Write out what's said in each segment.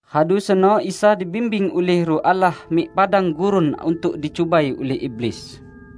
Radu seno Isa dibimbing ulih Ruh Allah mik padang gurun untuk dicubai ulih iblis.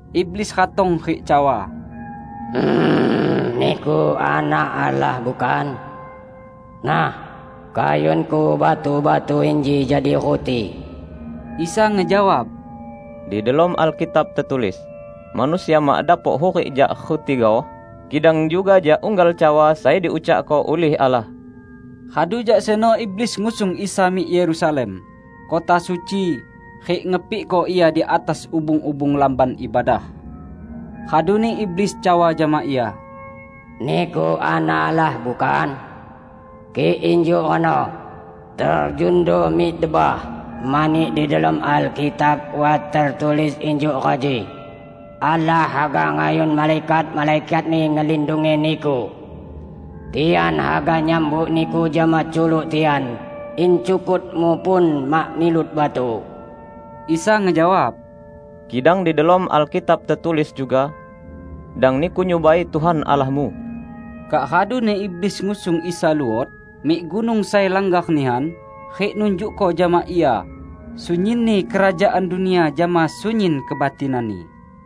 Iblis ratong rik cawa, "Niku Anak Allah, bukan? Nah, kayunko batu-batu inji jadi ruti." Isa ngejawab, "Di delom Alkitab tetulis: Manusia mak dapok hurik jak ruti gaoh, kidang juga jak unggal cawa sai diucakko ulih Allah." Radu jak seno iblis ngusung Isa mik Yerusalem, kota suci, rik ngepikko Ia di atas ubung-ubung Lamban Ibadah. Raduni iblis cawa jama Ia, "Niku Anak Allah, bukan? Kik injuk reno, terjundo mik debah; mani di delom Alkitab wat tetulis injuk reji, 'Allah haga ngayun malaikat-malaikat-Ni ngelindungi Niku, tian haga nyambut Niku jama culuk tian, in cukut-Mu pun mak nilut batu.' " Isa ngejawab, "Kidang di delom Alkitab tetulis juga, 'Dang niku nyubai Tuhan Allahmu.' " Kak raduni iblis ngusung Isa luot mik gunung sai langgar nihan rik nunjukko jama Ia sunyinni kerajaan dunia jama sunyin kebatinanni.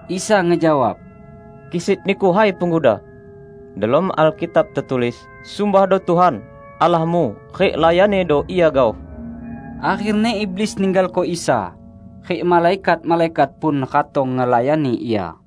Isa ngejawab, "Kisit niku, hai Pengguda! Delom Alkitab tetulis: Sumbahdo Tuhan, Allahmu, rik layannido Ia gaoh!" Akherni iblis ninggalko Isa, rik malaikat-malaikat pun ratong ngelayani Ia.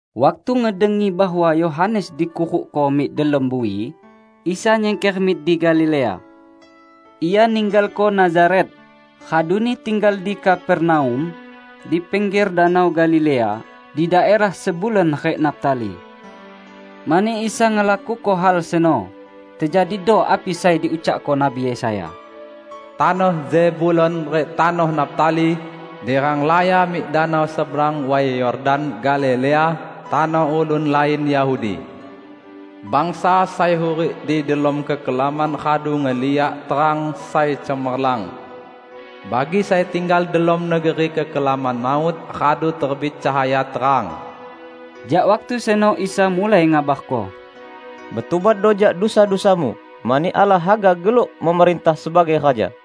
Waktu ngedengi bahwa Yohanes dikurukko mik delom bui, Isa nyingker mik di Galilea. Ia ninggalko Nazaret, raduni tinggal di Kapernaum di pingger Danau Galilea di daerah Zebulon rik Naftali. Mani Isa ngelakuko hal seno, tejadido api sai diucakko Nabi Yesaya: "Tanoh Zebulon rik tanoh Naftali, di renglaya mik danau, seberang Way Yordan, Galilea tanoh ulun lain Yahudi! Bangsa sai hurik di delom kekelaman radu ngeliak terang sai cemerlang! Bagi sai tinggal delom negeri kekelaman maut radu terbit cahaya terang!" Jak waktu seno Isa mulai ngabarko, "Betubatdo jak dusa-dusamu, mani Allah haga geluk memerintah sebagai Raja!"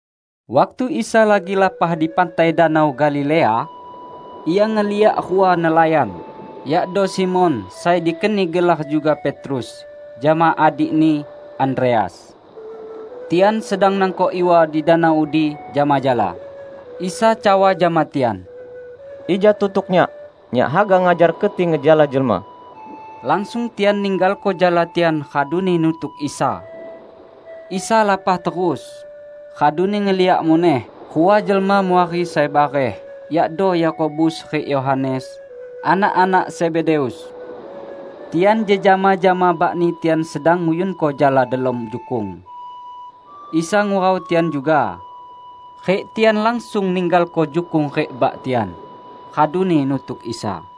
Waktu Isa lagi lapah di pantai Danau Galilea, Ia ngeliak rua nelayan, yakdo Simon (sai dikeni gelar juga Petrus) jama adikni, Andreas. Tian sedang nangkok iwa di danau udi jama jala. Isa cawa jama tian, "Ija tutuk Nyak. Nyak haga ngajar keti ngejala jelma." Langsung tian ninggalko jala tian raduni nutuk Isa. Isa lapah terus, raduni ngeliak muneh rua jelma muari sai bareh, yakdo Yakobus rik Yohanes, anak-anak Zebedeus. Tian jejama jama bakni tian sedang nguyunko jala delom jukung. Isa ngurau tian juga, rik tian langsung ninggalko jukung rik bak tian, raduni nutuk Isa.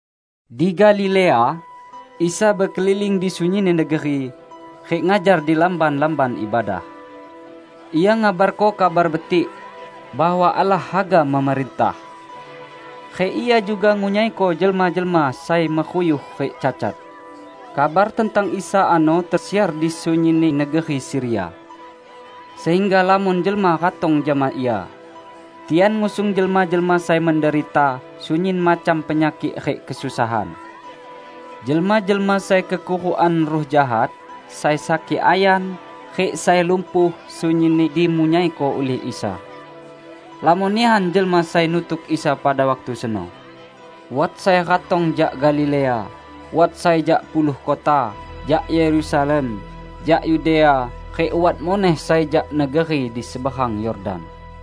Di Galilea, Isa bekeliling di sunyinni negeri rik ngajar di lamban-lamban ibadah. Ia ngabarko Kabar Betik bahwa Allah haga memerintah. Rik Ia juga ngunyaiko jelma-jelma sai meruyuh rik cacat. Kabar tentang Isa ano tesiar di sunyinni negeri Siria, sehingga lamon jelma ratong jama Ia. Tian ngusung jelma-jelma sai menderita sunyin macam penyakik rik kesusahan. Jelma-jelma sai kekurukan ruh jahat, sai sakik ayan, rik sai lumpuh, sunyinni dimunyaiko ulih Isa. Lamon nihan jelma sai nutuk Isa pada waktu seno. Wat sai ratong jak Galilea, wat sai jak Puluh Kota, jak Yerusalem, jak Yudea, rik wat muneh sai jak negeri di seberang Yordan.